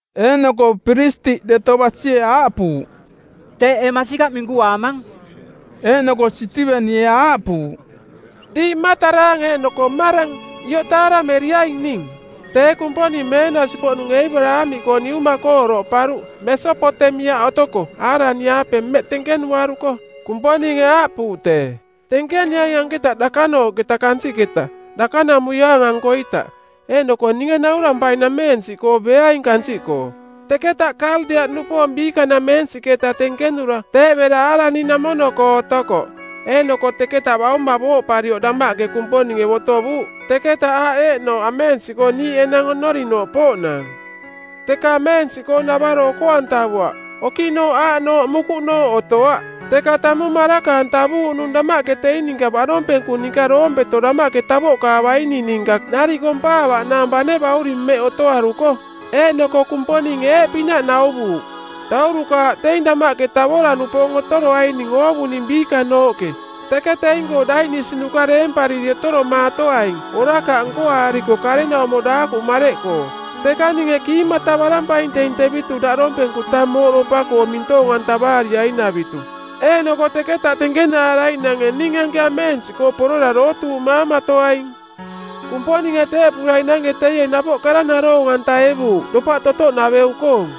Eeꞌnoko piristiꞌ deto basie aaꞌpuuꞌ, “Teeꞌ ee masikaꞌ minkuaamang?” Eeꞌnoko Sitivenie aaꞌpuuꞌ, “Diiꞌ mmataraang eeꞌnoko mmarang, ioꞌ taarameriaing ning. Tee Kumponing meenasi-poꞌnung Eebaraamiꞌkoo niuma-koo oroꞌparuꞌ Mesopotemiaꞌ otoko Aaraniꞌaape mmeꞌ tenkenuaruko. Kumponinge aaꞌpuuꞌ tee, ‘Tenkeniaing anketa dakanooꞌketa kansiꞌketa, dakanamuiaang-ankoita, eeꞌnoko ninge naurampainameensiꞌkoo beaing kansiꞌkoo.’ “Teketa Kaldea-nupoong biikanameensiꞌketa tenkenura tee bera Aaraniꞌnamono-koo otokoꞌ. Eeꞌnoko teketa bauma booꞌparioꞌ damaꞌke Kumponinge botovuuꞌ teketa aaꞌ eeꞌnooꞌ ameensiꞌkoo niiꞌ enang oꞌnorinooꞌ pooꞌnaang. Teka ameensiꞌkoo navaro oko-antavuaꞌ, okiꞌnooꞌ aaꞌnooꞌ mukuꞌnooꞌ otoaꞌ. Teka tamung maraka-antavuuꞌnung damaꞌke teing ninka baꞌdompenku ninka doompeto damaꞌke tavoꞌkaavaining ninka nariꞌ kompaavaꞌnaang bane bauring mmeꞌ otoaruko. Eeꞌnoko Kumponinge eeꞌpinaꞌ nauvuuꞌ, ‘Daurukaaꞌ teing damaꞌke tavora-nupoong otoroaining oovuning biikanooꞌke, teke teing-koo daiꞌnisinuka deempariri otoromaatoaing orakaꞌ nkoaariko karenaumo daakuꞌ mareꞌkoo. Teka ninge kiimatavarampaing teing tevitu daꞌdompenku tang mooꞌdopa-koo mintoong-antavaariainavitu. Eeꞌnoko teketa tenkenaaraiꞌnange ning anke ameensiꞌkoo porora dootuuꞌmaamatoaing.’ “Kumponinge teeꞌpuraiꞌnange teie napoꞌ kara naroong-antaevuuꞌ dopaꞌ totoꞌnaveu-koong.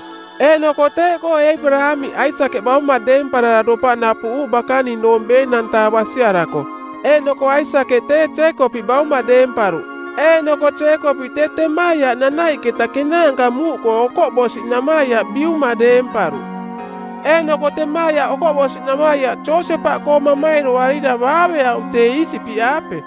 Eeꞌnoko teeꞌkoo Eebaraamiꞌ Aisakeꞌ bauma deemparara dopaꞌ napuꞌuuꞌ bakaning doong ˜beenang-taa basiarako. Eeꞌnoko Aisakeꞌ tee Jeekopiꞌ bauma deemparuꞌ eeꞌnoko Jeekopiꞌ tee temaiaꞌ nanaiꞌketa kenaanka muuꞌkoo okoꞌbosiꞌnamaiaꞌ biuma deemparuꞌ.” “Eeꞌnoko temaiaꞌ okoꞌbosi-namaiaꞌ Josepaꞌkoo mamairoarira baaveauꞌ tee Iisipiꞌaape,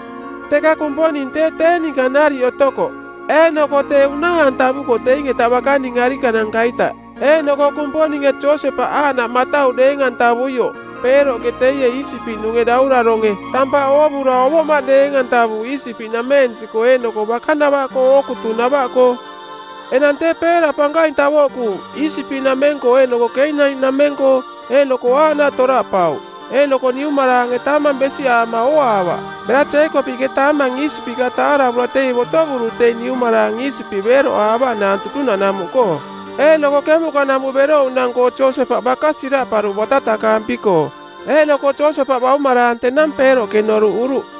teka Kumponing tee tee ninka nariꞌ otokoꞌ. Eeꞌnoko tee unaa-antavukoꞌ teing-eta bakaning arikananka-ita. Eeꞌnoko Kumponinge Josepaꞌ aaꞌnaꞌ matau deeng-antavuioꞌ Peeroꞌke, teie Iisipiꞌnunge dauraronge˜, tampaꞌ oovura ovoꞌmaꞌ deeng-antavuuꞌ Iisipiꞌnameensiꞌkoo eeꞌnoko bakanavaꞌkoo ookutunava-koo. “Enang tee peera pankaing tavoꞌkuuꞌ Iisipiꞌnameng-koo eeꞌnoko Keenani-nameng-koo, eeꞌnoko aaꞌnaꞌ toraꞌpauꞌ. Eeꞌnoko niumaraange taamang besiꞌaama ooaavaꞌ. Bera Jeekopiꞌke taamang Iisipiꞌka taaravura teie botovuruꞌ teing niumaraang Iisipiꞌ beeroꞌaavaꞌnaang tutunaꞌnamuꞌkoo. “Eeꞌnoko kemuꞌkanamuꞌ berouꞌnang-koo Josepaꞌ baka siraꞌparuꞌ batatakaampi-koo, eeꞌnoko Josepaꞌ baumaraang tenang Peeroꞌke noruꞌuruꞌ.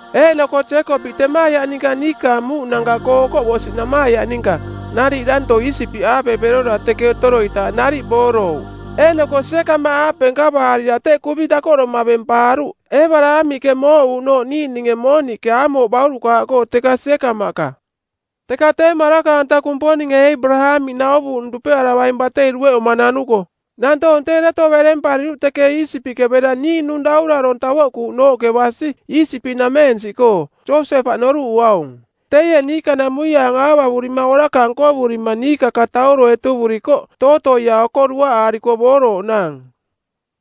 Eeꞌnoko Jeekopiꞌ temaiaꞌ ninka, niikaang muuꞌnanka-koo okoꞌbosiꞌnamaiaꞌ ninka, nariꞌ danto Iisipiꞌaape berora teke otoroitaaꞌ nariꞌ boorouꞌ. Eeꞌnoko Siekamaꞌaape nkavaarira teꞌ kuvi dakoꞌdoma bempaaruꞌ Eebaraamiꞌke mooꞌuuꞌnooꞌ niiꞌninge mooniꞌke Aamoo baurukaaꞌkoo teka Siekamaꞌka.” “Teka tee maraka-anta Kumponinge Eebaraamiꞌ nauvuuꞌnung dupearavaing-koong batei dueꞌuma nanuko nantoong tee deto berempariruꞌ teke Iisipiꞌke bera niiꞌnung daurarong tavoꞌkuuꞌnooꞌke basi Iisipiꞌnameensiꞌkoo, Josepaꞌ noruꞌuaung. Teie niikanamuiaang aavavurima orakaꞌ nkovurima niikakatauro etuvurikoꞌ tootoia oko duaꞌaariko boorooꞌnaang.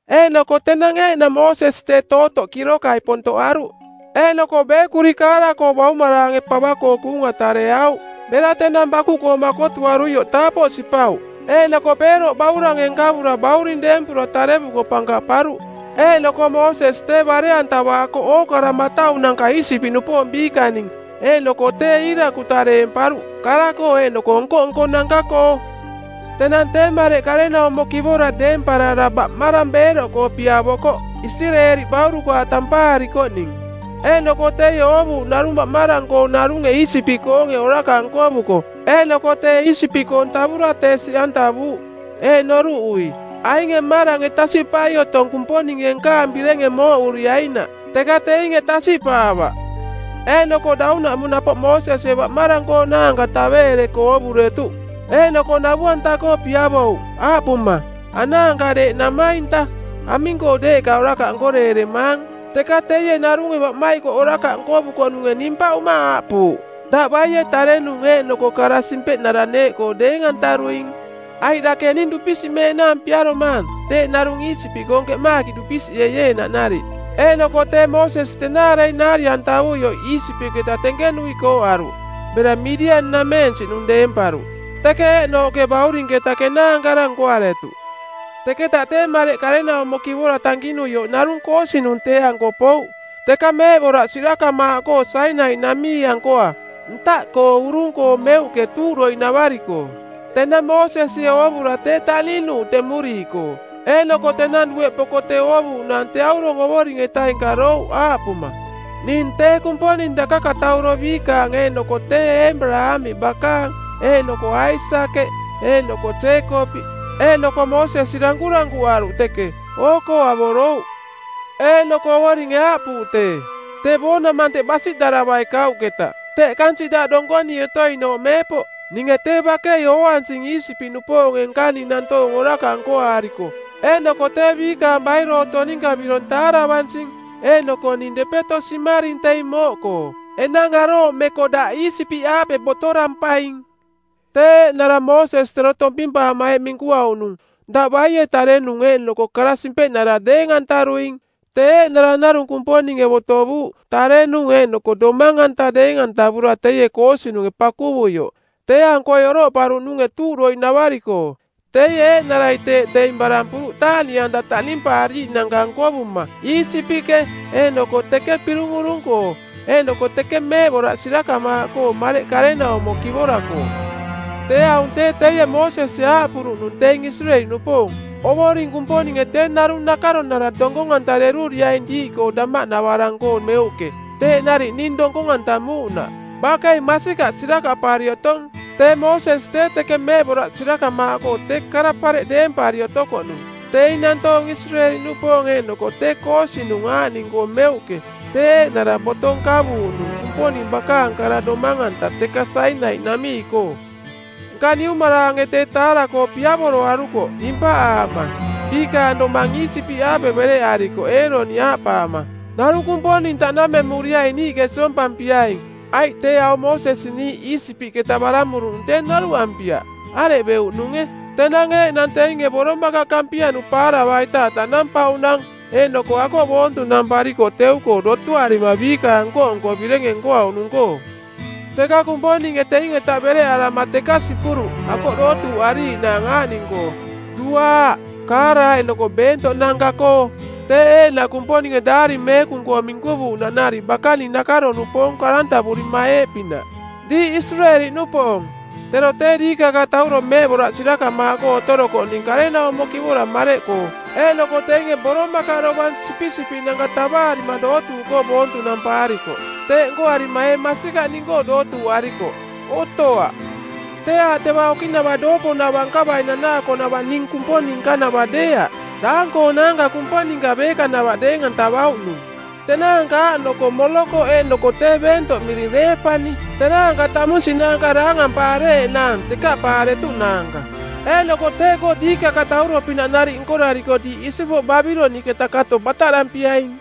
Eeꞌnoko tenang eeꞌnang Moosesi tee tootoꞌ kirokai pontoꞌaruꞌ. Eeꞌnoko beekuri kaara-koo baumaraange pava-koo kuunga tareauꞌ. Bera tenang bakuꞌkoo makotuaruioꞌ taapoꞌ sipauꞌ, eeꞌnoko Peeroꞌ baurange nkavura bauring deempura tarevuko pankaꞌparuꞌ. Eeꞌnoko Moosesi tee bare-antavaakoꞌ ookara mataunanka Iisipiꞌnupoong biikaning, eeꞌnoko tee iirakuta deemparuꞌ kara-koo eeꞌnoko nko-nkonanka-koo. “Tenang tee mareꞌ karenaumo kivora deemparara baꞌmarang beeroꞌkoo piavokoꞌ, Isireeli baurukaaꞌ tampaarikoꞌning. Eeꞌnoko teie oovuuꞌ narung baꞌmarang-koong narunge Iisipiꞌkoonge orakaꞌ nkovuko, eeꞌnoko tee Iisipiꞌkoong tavura tee siꞌantavuuꞌ. Eeꞌ noruꞌui, ‘Ainge mmarange tasiꞌpai otong Kumponinge nkaang birenge mooꞌuriainaꞌ.’ Teka teinge tasiꞌpaavaꞌ. Eeꞌnoko daunaꞌmung napoꞌ Moosesie baꞌmarang-koonaanka taveereko oovuretuꞌ. Eeꞌnoko navu-anta-koo piavouꞌ aaꞌpuma, ‘Anaanka, deeꞌ namainta. Aming-koo deeꞌka orakaꞌ nkoreeremaang?’ Teka teie narunge baꞌmaikoꞌ orakaꞌ nkovukoꞌnunge nimpaꞌuma aaꞌpuuꞌ, ‘Daꞌ baie tarenung eeꞌnoko kara simpeꞌnara˜ neeꞌkoo deeng-antaruing? Aiꞌ dake ning dupisiꞌmeeꞌnaang piaromaang teeꞌ narung Iisipiꞌkoong keꞌmaakiꞌ dupisiꞌeieenaꞌ nariꞌ?’ Eeꞌnoko tee Moosesi tenaarei naari-antavuioꞌ Iisipiꞌketa tenkenui kooꞌaruꞌ bera Midian-nameensiꞌnung deemparuꞌ, teke eeꞌnooꞌke baurinketa kenaankara nkoaretuꞌ. “Teketa tee mareꞌ karenaumo kivora tankinuioꞌ narung koosinung˜ tee-anko pouꞌ teka meeꞌboraꞌ sirakamaaꞌkoo Sainai-namii-ankoa, ntaꞌkoo urung-koo meuꞌke tuuꞌdoiꞌnavari-koo. Tenang Moosesie oovura tee taꞌninuuꞌ temuriiꞌkoo, eeꞌnoko tenang dueꞌ poko tee oovuuꞌnaang tee aurong Ovoring-etaing karouꞌ aaꞌpuma, ‘Ning tee Kumponing dakakatauro biikaang eeꞌnoko tee Eebaraamiꞌ bakaang, eeꞌnoko Aisakeꞌ eeꞌnoko Jeekopiꞌ.’ Eeꞌnoko Moosesi dankurankuꞌaruꞌ teke, oo-koo avorouꞌ. Eeꞌnoko Ovoringe aaꞌpuuꞌ tee, ‘Tee boonamante˜ basiꞌdaravai kauꞌketa. Teꞌ kansiꞌ daꞌ donkonii otoinooꞌ meepoꞌ. Ninge tee bakei ooansing Iisipiꞌnupoonge nkaning nantoong orakaꞌ nkoaariko, eeꞌnoko tee biikaang bairooto ninka birong taaravansing, eeꞌnoko ning depeto simaring teing mooꞌkoo. Enang arooꞌmeko daꞌ Iisipiꞌaape botorampaing.’ “Tee eeꞌnara Moosesi tero tompimpaama eeꞌ minkuauꞌnung, ‘Daꞌ baie tarenung eeꞌnoko kara simpeꞌnara˜ deeng-antaruing?’ – tee eeꞌnara narung Kumponinge botovuuꞌ tarenung eeꞌnoko domang-anta deeng-antavura teie koosinunge pakuvuioꞌ, tee-ankoi oroꞌparuꞌnunge tuuꞌdoiꞌnavari-koo. Teie eeꞌnarai teeꞌ teing barampuruꞌ taaꞌniꞌanta taꞌnimpaariiꞌnanka nkovuma Iisipiꞌke eeꞌnoko teke Pirung Urung-koo eeꞌnoko teke meeꞌboraꞌ sirakamaaꞌkoo mareꞌ karenaumo kivora-koo. “Tee aung tee teie Moosesie aaꞌpuruꞌnung teing Isireeli-nupoong, ‘Ovoring Kumponinge tee narung nakaronara donkong-antareruriaing diiꞌkoo damaꞌnavarang-koo meuꞌke, teeꞌ nariꞌ ning donkong-antamuuꞌnaꞌ.’ Bakei masikaꞌ sirakaꞌpari otong, tee Moosesi tee teke meeꞌboraꞌ sirakamaaꞌkoo tee kara pareꞌ deempari otokoꞌnung teing nantoong Isireeli-nupoong eeꞌnoko tee koosinung aaꞌning-koo meuꞌke tee eeꞌnara boto nkavuuꞌnung Kumponing bakaang kara domang-anta teka Sainai-namii-koo. “Nka niumaraange tee taara-koo piavoroarukoꞌ dimpaꞌaama. Biikaang domang Iisipiꞌaape bereꞌarikoꞌ Eeroni aaꞌpaama, ‘Narung kumponing taꞌnamemuriaing niiꞌke siompampiaing, aiꞌ tee aung Moosesi niiꞌ Iisipiꞌketa baramuruꞌnung tee noruꞌampiaꞌ areꞌ beuꞌnunge.’ Tenang eeꞌnang teinge boromakaꞌ kampianu paaravaitaaꞌ taꞌnampauꞌnang, eeꞌnoko akoꞌ boontunamparikoꞌ teu-koo, dotuarima biikaang nko-nko birenge nkoauꞌnung-koo. Teka Kumponinge teing-eta bereꞌarama teka sipuruꞌ akoꞌ dootuuꞌariiꞌnaang aaꞌning-koo: duaaꞌ, kaara eeꞌnoko beentoꞌnanka-koo, teeꞌ eeꞌnaꞌ Kumponinge Daari Meekung-koo minkuvuuꞌnaꞌ nariꞌ bakaning nakaro-nupoong karantavurima eeꞌpinaꞌ, ‘Diiꞌ Isireeli-nupoong, tero tee diikakatauro meeꞌboraꞌ sirakamaaꞌkoo otorokoꞌning karenaumo kivora mareꞌkoo, eeꞌnoko teinge boromakaꞌ dovang sipisipiꞌnanka tavaarima dootuuꞌkoo boontunampaarikoꞌ. Teeꞌ nkoarima ee masikaꞌ ning-koo dootuuꞌarikoꞌ? Otoaꞌ. Tee aaꞌ teva okiꞌnava dooponava nkavai nanaakoꞌnava ning Kumponing nkanava deeaꞌ, daang-koonaanka kumponinka beekanava deeng-antavauꞌnung, tenaanka aaꞌnoko Molokoꞌ eeꞌnoko tee beentoꞌ miring Reepani, tenaanka tamunsiꞌnaanka daangampaareeꞌnaang tekaꞌpaaretuꞌnaanka. Eeꞌnoko teeꞌkoo diikakatauro-pinaꞌ nariꞌ nkorariko diiꞌ isipoꞌ Babiloniꞌketa kato bataꞌdampiaing.’”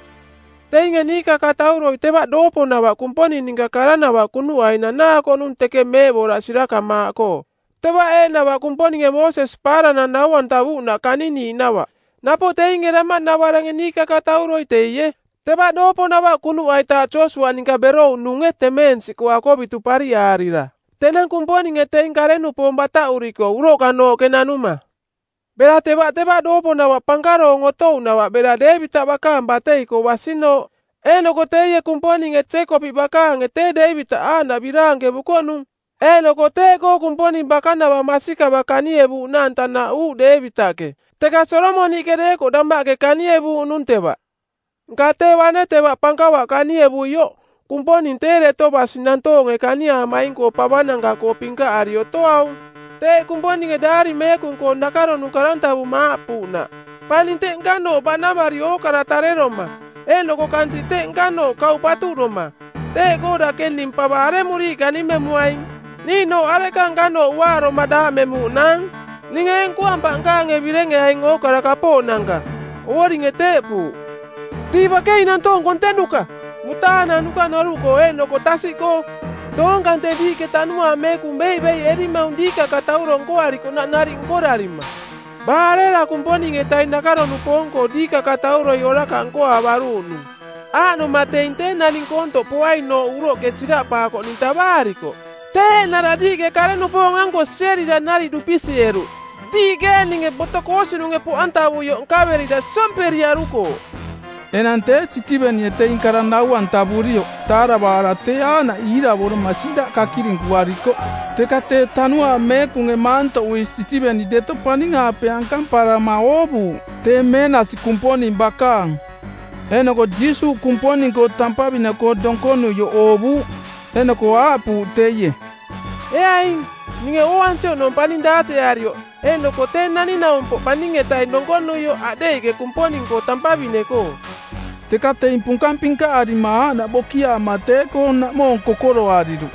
“Teinge niikakatauroi teva dooponava Kumponing ninka karanava kunuꞌai nanaakoꞌnung teke meeꞌboraꞌ sirakamaaꞌkoo. Teva eeꞌnava Kumponinge Moosesi paaranang nau-antavuuꞌnaꞌ kaniniiꞌnava. Napoꞌ teinge damaꞌnavarange niikakatauroi teie, teva dooponava kunuꞌaitaaꞌ Josiuaꞌ ninka berouꞌnunge temeensiꞌkoo akovitu pariꞌaarira tenang Kumponinge teing kare-nupoong bataꞌuriko uroꞌkanooꞌke nanuma. Bera teva teva dooponava pankaroong otouꞌnava bera Deevitaꞌ bakaang batei-koo basinooꞌ. Eeꞌnoko teie Kumponinge Jeekopiꞌ bakaange tee Deevitaꞌ aaꞌnaꞌ biraankevukoꞌnung, eeꞌnoko teeꞌkoo Kumponing bakanavaꞌ masikavaꞌ kanievuuꞌnaang tanaꞌuuꞌ Deevitaꞌke. Teka Solomoniꞌke deekoꞌ damaꞌke kanievuuꞌnung teva. Nka tee bane teva pankava kanievuioꞌ, Kumponing tee deto basi, nantoonge kaniaamaing-koo pavananka-koo pinkaꞌari otoaung. Teeꞌ Kumponinge Daari Meekung-koo nakaronung karantavuma aaꞌpuuꞌnaꞌ, ‘Paning teꞌ nkanooꞌ baꞌnamari ookara tareroma, eeꞌnoko kansiꞌ teꞌ nkanooꞌ kauꞌ patuꞌdoma. Teeꞌkoo dake ning pava aremuriiꞌ kanimemuaing? Niiꞌnooꞌ areꞌka nkanooꞌ uaaroma daaꞌmemuuꞌnaang? Ninge ee nkoampaꞌ nkaange birenge aing ookara kapooꞌnanka? Ovoringe teeꞌpuuꞌ.’ “Diiꞌ bakei nantoong kontenuka, mutaananuka noruꞌkoo eeꞌnoko tasiꞌkoo. Doong kante diiꞌke Tanuaang Meekung beiꞌbeiꞌerimaung diikakatauro nkoarikoꞌnaꞌ nariꞌ nkorarima. Baa arera Kumponing-etaing nakaro-nupoong-koo diikakatauroi orakaꞌ nkoaavaruuꞌnung? Aaꞌnoma teing tee Naning Koontoꞌ poainooꞌ uroꞌke siraꞌpaakoꞌning tavaarikoꞌ, tee eeꞌnara diiꞌke kare-nupoong-anko sierira nariꞌ dupisiꞌeruꞌ; Diiꞌke eeꞌninge boto koosinunge poꞌantavuioꞌ nkaverira siomperiarukooꞌ.” Enang tee Sitivenie teing kara nau-antavurioꞌ taaravaara tee aaꞌnaꞌ iiravoroma siꞌdaꞌ kakirinkuarikoꞌ. Teka tee Tanuaang Meekunge maantoꞌui Sitiveni deto paning-aape ankamparama oovuuꞌ tee meenasi Kumponing bakaang, eeꞌnoko Jiisuuꞌ Kumponing-koo tampavine-koo donkonuioꞌ oovuuꞌ. Eeꞌnoko aaꞌpuuꞌ teie, “Ee aing, ninge ooansi oꞌnong paning daateꞌarioꞌ eeꞌnoko Tee Naning-naumpoꞌ Paning-etaing donkonuioꞌ aꞌdeiꞌke Kumponing-koo tampavine-koo.” Teka teing punkang pinkaꞌarima aaꞌnaꞌ bokiaama tee-koo naꞌmoong kokoroariruꞌ.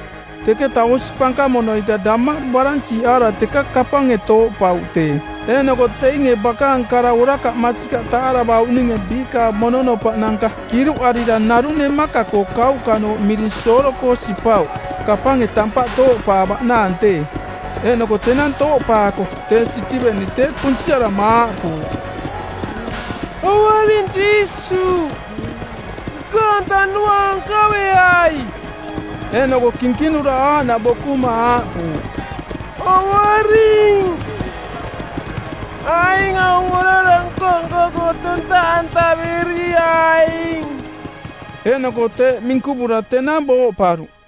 Teketa osi pankamono-ita damaꞌdu baransiꞌaara teka kapange tooꞌpauꞌ tee. Eeꞌnoko teinge bakaang kara orakaꞌ masikaꞌ taaravauꞌninge biikaang mononopaꞌnanka kiruꞌarira narung nemaka-koo kauꞌkanooꞌ miring Soolo-koo sipauꞌ kapange tampaꞌ tooꞌpaavaꞌnaang tee. Eeꞌnoko tenang tooꞌpaako tee Sitiveni tee kunsiarama aaꞌpuuꞌ, “Ovoring Jiisuuꞌ, nkaang tanuaang nkaveai.” Eeꞌnoko kinkinura aaꞌnaꞌ bokuma aaꞌpuuꞌ, “Ovoring, aing aung orara nko-nko-koo tontaꞌantaveriaing.” Eeꞌnoko teeꞌ minkuvura tenang booꞌparuꞌ.